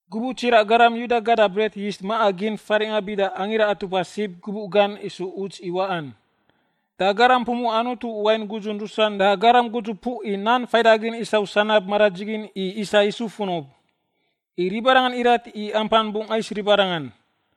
Gubuꞌ tsiraꞌ garam Yuda gada bret yist maꞌa gin faringꞌa bida Angira Atupa Sib gubuꞌ gan isu uts i waꞌan. Da garam pumuꞌa Anutu wain gudzun rusan da garam gudzupuꞌ i nan faidagin isau sanab maradzigin i isa Yisu funub, i ribarangan irat i ampan bungꞌ ais ribarangan.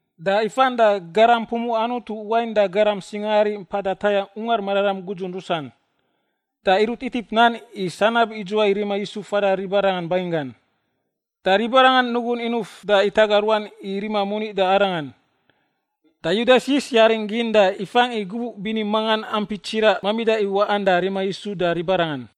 da ifan da garam pumuꞌa Anutu wain da garam singaari mpada tayangꞌ Ungar Mararam gudzun rusan. Da irut itip nan i sanab idzuwai rima Yisu fada ribarangan banginggan. Da ribarangan nugun inuf da itaga ruan i rima moni da arangan. Da Yudas yis yaring gin da ifangꞌ i gubuꞌ bini mangan ampi tsiraꞌ mamida i waꞌan da rima Yisu da ribarangan.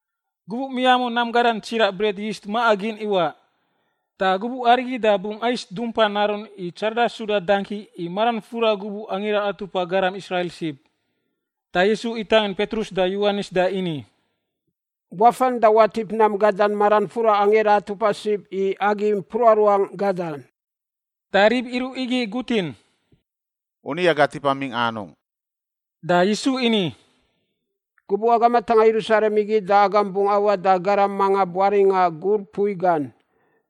Gubuꞌ miamun nam gadan tsiraꞌ bret yist maꞌa gin iwaꞌ. Da gubuꞌ arigi da bungꞌ ais dumpa narun i tsarada suda dangki i maran fura gubuꞌ Angira Atupa Garam Israil Sib. Da Yisu itangin Petrus da Yowanis da ini, “Wafan da watip nam gadan maran fura Angira Atupa Sib i agi mpruꞌa ruangꞌ gadan.” Da rib iruꞌ igi igutin, “U ni aga tipa mingꞌa anungꞌ?” Da Yisu ini, “Gubuꞌ agam atangꞌa Yerusalem igi da agam bungꞌ awaꞌ da garam manga buaringꞌa gur mpui gan,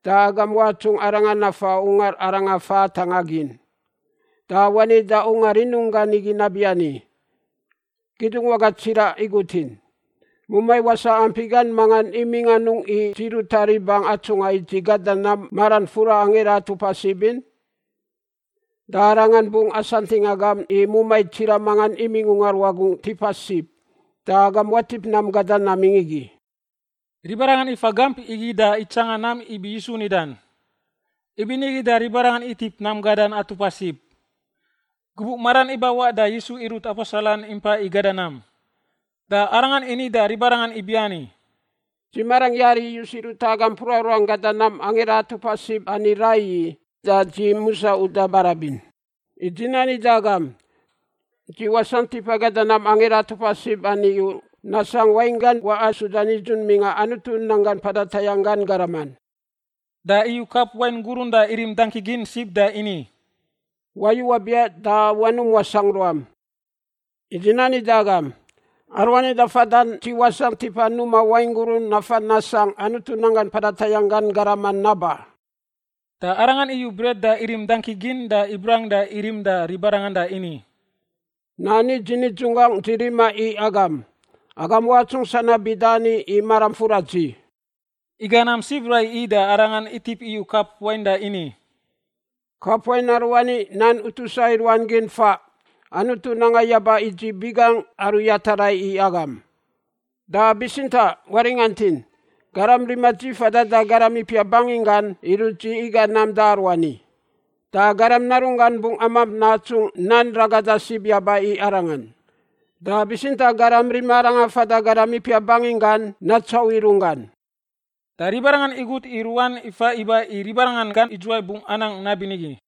da agam watsungꞌ arangan nafa ungar aranga fa atangꞌa gin. Da wani da ungar rinunggan igi nabiani, ‘Kidungwaga tsiraꞌ igutin: Mumai wasaꞌ ampi gan mangan imingꞌ anungꞌ i dzi ruta ribangꞌ atsungꞌa i dzi gada nam maran fura Angira Atupa Sib in?’ Da arangan bungꞌ asantingꞌ agam i mumai tsiraꞌ mangan imingꞌ ungar wagungꞌ tipa sib, da agam watip nam gadan namingꞌ igi.” Ribarangan ifa gamp igi da itsangan nam ibi Yisu nidan, ibinigi da ribarangan itip nam gadan Atupa Sib. Gubuꞌ maran ibawaꞌ da Yisu irut aposelan impa i gada nam. Da Arangan ini da ribarangan ibiani, “Dzi marangꞌ yari iyus i ruta agam mpruꞌa ruangꞌ gada nam Angira Atupa Sib ani raiyi da dzi musa uda barabin. I dzi nani da agam, dzi wasangꞌ tipa gada nam Angira Atupa Sib ani u, nasangꞌ wainggan waꞌa suda nidzun mingꞌa Anutu nanggan mpada tayangꞌ gan garaman.” Da iyu kap wain gurun da irim dangki gin sib da ini, “Wayu wabiaꞌ da wanum wasangꞌ ruam. I dzi nani da agam, aruani da fadan dzi wasangꞌ tipa numa wain gurun nafan nasangꞌ Anutu nanggan mpada tayangꞌ gan garaman naba.” Da Arangan iyu bret da irim dangki gin da ibrang da irim da ribarangan da ini, “Nani dzi nidzunggangꞌ dzi rima i agam; agam watsungꞌ sanab bida ani i maram fura dzi.” Iga nam sib raiyi da Arangan itip iyu kap wain da ini, “Kap wain aruani nan utusa i ruan gin faꞌ Anutu nanga yaba i dzi biꞌ gangꞌ, aru yata rai i agam. “Da bitsintaꞌ waringantin! Garam rima dzi fadan da garam ipiap banginggan irut dzi iga nam da aruani. Da Garam Narunggan bungꞌ amamp natsungꞌ nan ragada sib yaba i Arangan, da bitsintaꞌ garam rima Arangan fada garam ipiap banginggan natsauꞌ i runggan!” Da ribarangan igut i ruan ifa iba i ribarangan gan idzuwai bungꞌ anang nabinigi.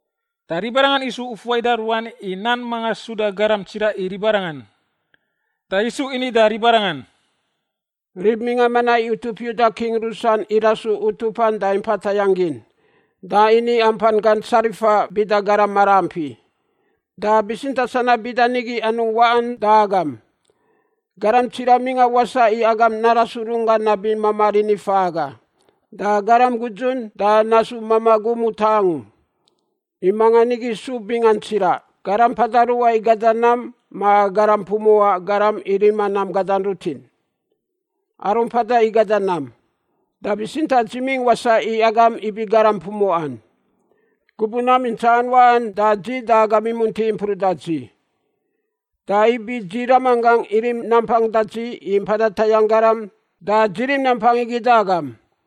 Da ribarangan isu ufuai da ruan i nan manga suda garam tsiraꞌ i ribarangan. Da Yisu ini da ribarangan, “Rib mingꞌa manaꞌ i utup Yuda king rusan irasu utupan da impa tayangꞌ gin, da ini ampan gan tsarifa bida garam maraampi. Da bitsintaꞌ sanab bida nigi anungꞌ waꞌan da agam. Garam tsiraꞌ mingꞌa wasaꞌ i agam narasu runggan nabi mamaꞌ rini faꞌ aga, da garam gudzun da nasu mamaꞌ gum utaꞌ angu. I mangan igi su bingan tsiraꞌ, garam mpada ruꞌa i gada nam ma garam pumuꞌa garam i rima nam gadan rutin? Aru mpada i gada nam! Da bitsintaꞌ dzi mingꞌ wasaꞌ i agam ibi garam pumuꞌan. Gubuꞌ nam intsaꞌan waꞌan da dzi da agam imunti impruꞌ da dzi. Da ibi dzi ramanggangꞌ irim nampang da dzi i mpada tayangꞌ garam da dzi rim nampang igi da agam.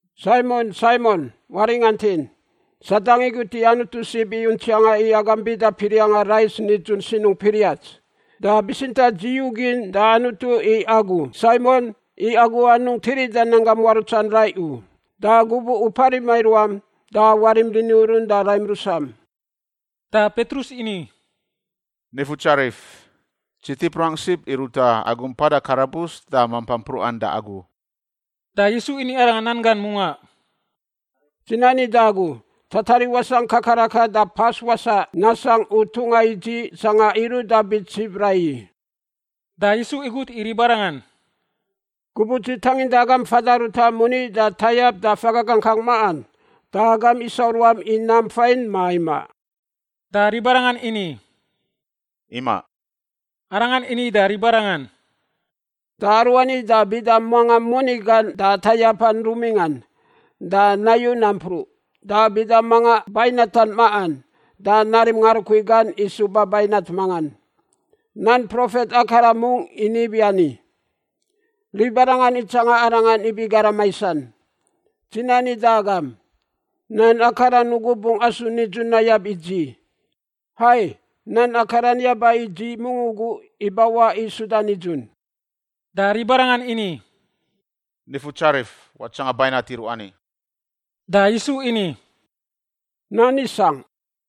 “Saimon, Saimon, waringantin, Sadang igut i Anutu sib i untsianga i agam bida piriangꞌa rais nidzun sinungꞌ piriats. Da bitsintaꞌ dzi yugin da Anutu i agu, Saimon, i agu anungꞌ tirida nanggam muarutsan rai u, da gubuꞌ u parima i ruam da warim rini urun da raim rusam.” Da Petrus ini, “Nifutsarif, dzi tip ruangꞌ sib i ruta agu mpada karabus da mampan mpruꞌan da agu.” Da Yisu ini arangan nan gan mungaꞌ, “Dzi nani da agu, tatariꞌ wasangꞌ kakarakan da pas wasaꞌ nasangꞌ u tungꞌa i dzi sangꞌa iruꞌ da bits sib raiyi.” Da Yisu igut i ribarangan, “Gubuꞌ dzi tanginda agam fada ruta moni da tayap da faga gangkang maꞌan, da agam isau ruam i nam fain, ma imaꞌ?” Da ribarangan ini, “Imaꞌ.” Arangan ini da ribarangan, “Da aruani da bida manga moni gan da tayapan rumingꞌan, da nayu nampruꞌ. Da bida manga bainatan maꞌan da narim ngarukui gan i suba bainat mangan. Nan profet akaran mungꞌ ini ibiani, ‘Ribarangan itsanga arangan ibi garam maisan.’ Dzi nani da agam, nan akaran ugu bungꞌ asu nidzun nayab i dzi. Hai, nan akaran yaba i dzi mungꞌ ugu ibawaꞌ i suda nidzun.” Da ribarangan ini, “Nifutsarif, watsangan bainat iruꞌ ani.” Da Yisu ini, “Nan isangꞌ.”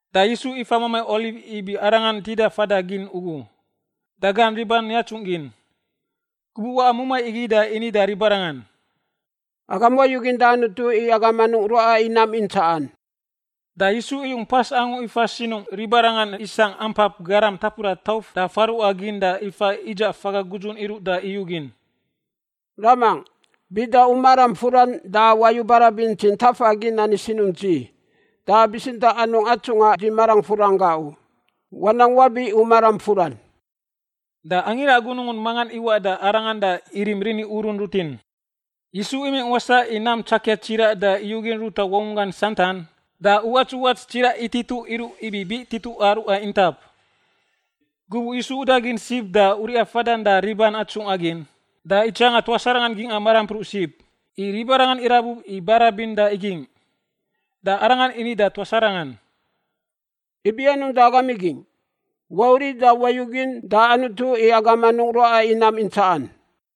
Da Yisu ifa Mamai Oliv ibi Arangan tida fada gin ugu, da gan riban yatsungꞌ gin. Gubuꞌ waꞌa mumai igi da ini da ribarangan, “Agam wayugin da Anutu i agam anungꞌ ruaꞌa i nam intsaꞌan.” Da Yisu iyung pas angu ifa sinungꞌ ribarangan isangꞌ ampap garam tapuda tauf da faruwaꞌa gin da ifa idzaꞌ faga gudzun iruꞌ da iyugin, “Ramangꞌ, bida u maram furan da wayu barabin dzi ntafa gin ani sinungꞌ dzi, da bitsintaꞌ anungꞌ atsungꞌa dzi marangꞌ furan gaꞌ u. Wanang wabi u maram furan.” Da angira gunungun mangan iwaꞌ da Arangan da irim rini urun rutin. Yisu imingꞌ wasaꞌ i nam tsakia tsiraꞌ da iyugin ruta wangunggan santan da uwats uwats tsiraꞌ itituꞌ iruꞌ ibi biꞌ tituꞌa ruꞌa intap. Gubuꞌ Yisu udagin sib da uriꞌa fadan da riban atsungꞌa gin, da itsanga tuas arangan gingꞌa marampruꞌ sib, i ribarangan irabub i barabin da igingꞌ, da Arangan ini da tuas arangan, “Ibi anungꞌ da agam igingꞌ? Wauriꞌ da wayugin da Anutu i agam anungꞌ ruaꞌa i nam intsaꞌan.”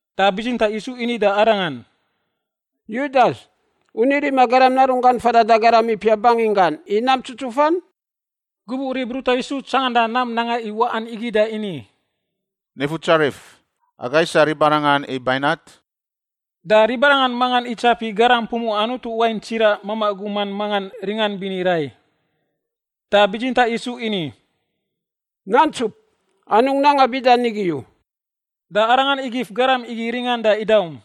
Da bitsintaꞌ Yisu ini da arangan, “Yudas, u ni rima Garam Narunggan fadan da rib ipiap banginggan i nam tsutsufan?” Gubuꞌ rib ruta Yisu tsanganda nam nanga i waꞌan igi da ini, “Nifutsarif, aga isa ribarangan i bainat?” Da ribarangan mangan itsapi garam pumuꞌa Anutu wain tsiraꞌ mamaꞌ guman mangan ringan bini rai. Da bitsintaꞌ Yisu ini, “Nantsup! Anungꞌ nanga bida nigi u.” Da Arangan igif garam igi ringan da idaum.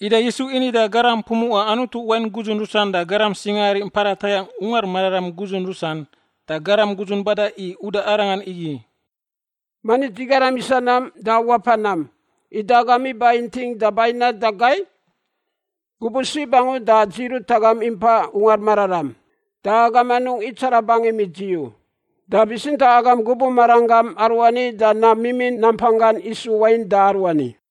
Ida Yisu ini da garam pumuꞌa Anutu wain gudzun rusan da garam singaari mpada tayangꞌ Ungar Mararam gudzun rusan da garam gudzun bada i uda Arangan igi, “Mani dzi garam isa nam da wapa nam, ida agam iba inting da bainat da gai? Gubuꞌ sib angu da dzi rut agam impa Ungar Mararam, da agam anungꞌ itsara bangim i dzi u. Da bitsintaꞌ agam gubuꞌ maran gam aruani da nam mimin nampanggan isu wain da aruani.”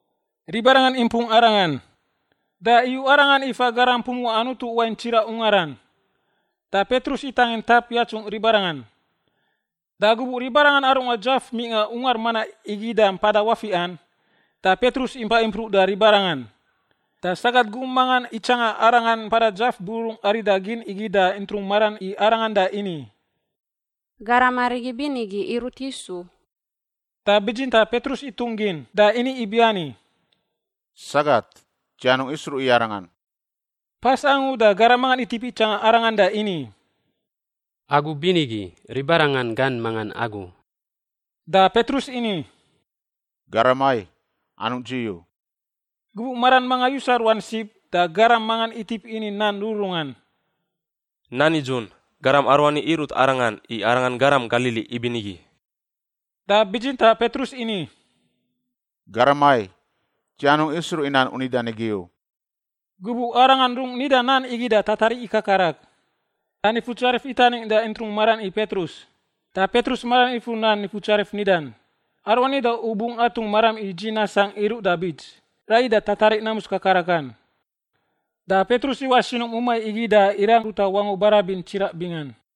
Ribarangan impung Arangan, da iyu Arangan ifa garam pumuꞌa Anutu wain tsiraꞌ ungaran. Da Petrus itangin tap yatsungꞌ ribarangan. Da gubuꞌ ribarangan arungꞌa dzaf mingꞌa ungar manaꞌ igi da mpada wafiꞌan, da Petrus impa impruꞌ da ribarangan. Da sagat gum mangan itsanga arangan mpada dzaf bururung arida gin igi da intrung maran i arangan da ini, “Garam arigi binigi irut Yisu.” Da bitsintaꞌ Petrus itungꞌ gin, da ini ibiani, “Sagat, dzi anungꞌ isruꞌ i arangan.” Pas angu da garam mangan itip itsanga arangan da ini, “Agu binigi, ribarangan gan mangan agu.” Da Petrus ini, “Garam ai, anungꞌ dzi u.” Gubuꞌ maran manga yusa ruan sib da garam mangan itip ini nan rururungan, “Nan nidzun, garam aruani irut arangan, i arangan garam Galili ibinigi.” Da bitsintaꞌ Petrus ini, “Garam ai, dzi anungꞌ isruꞌ i nan u nidan igi u!” Gubuꞌ arangan rung nida nan igi da tatariꞌ ikakarak. Da Nifutsarif itaning da intrung maran i Petrus, da Petrus maran ifur nan Nifutsarif nidan, “Aruani da u bungꞌ atungꞌ maram i dzi nasangꞌ iruꞌ da bits, raiyi da tatariꞌ namus kakarakan.” Da Petrus iwaꞌ sinungꞌ mumai igi da irang ruta wangu barabin tsiraꞌ bingan.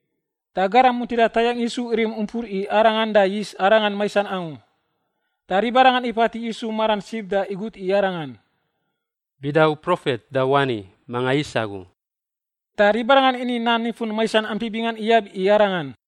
Da garam muntida tayangꞌ Yisu irim umpur i Arangan da yis Arangan maisan angu. Da ribarangan ipatiꞌ Yisu maran sib da igut i Arangan, “Bida u profet, da wani, manga is agu?” Da ribarangan ini nan nifun maisan ampi bingan iyab i Arangan.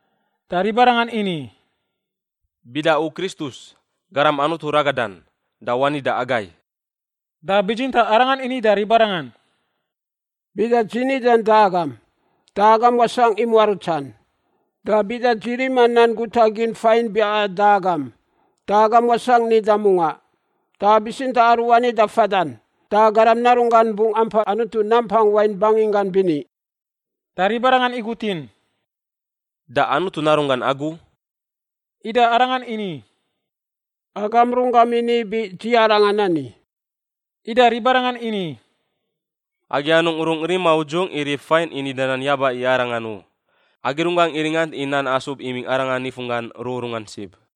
Da ribarangan ini, “Bida u Kristus, Garam Anutu ragadan, da wani da agai.” Da bitsintaꞌ Arangan ini da ribarangan, “Bida dzi nidan da agam, da agam wasangꞌ i muarutsan, da bida dzi rima nan guta gin fain biaꞌan da agam, da agam wasangꞌ nida mungaꞌ. Da bitsintaꞌ aruani da fadan, da Garam Narunggan bungꞌ ampa Anutu Nampang Wain banginggan bini.” Da ribarangan igutin, “Da Anutu Narunggan agu?” Ida Arangan ini, “Agam runggam ini ibi dzi Arangan ani.” Ida ribarangan ini, “Agi anungꞌ rungꞌ rima udzungꞌ i rib fain i nida nan yaba i arangan u. Agi runggangꞌ iringant i nan asub imingꞌ arangan nifunggan rururungan sib.”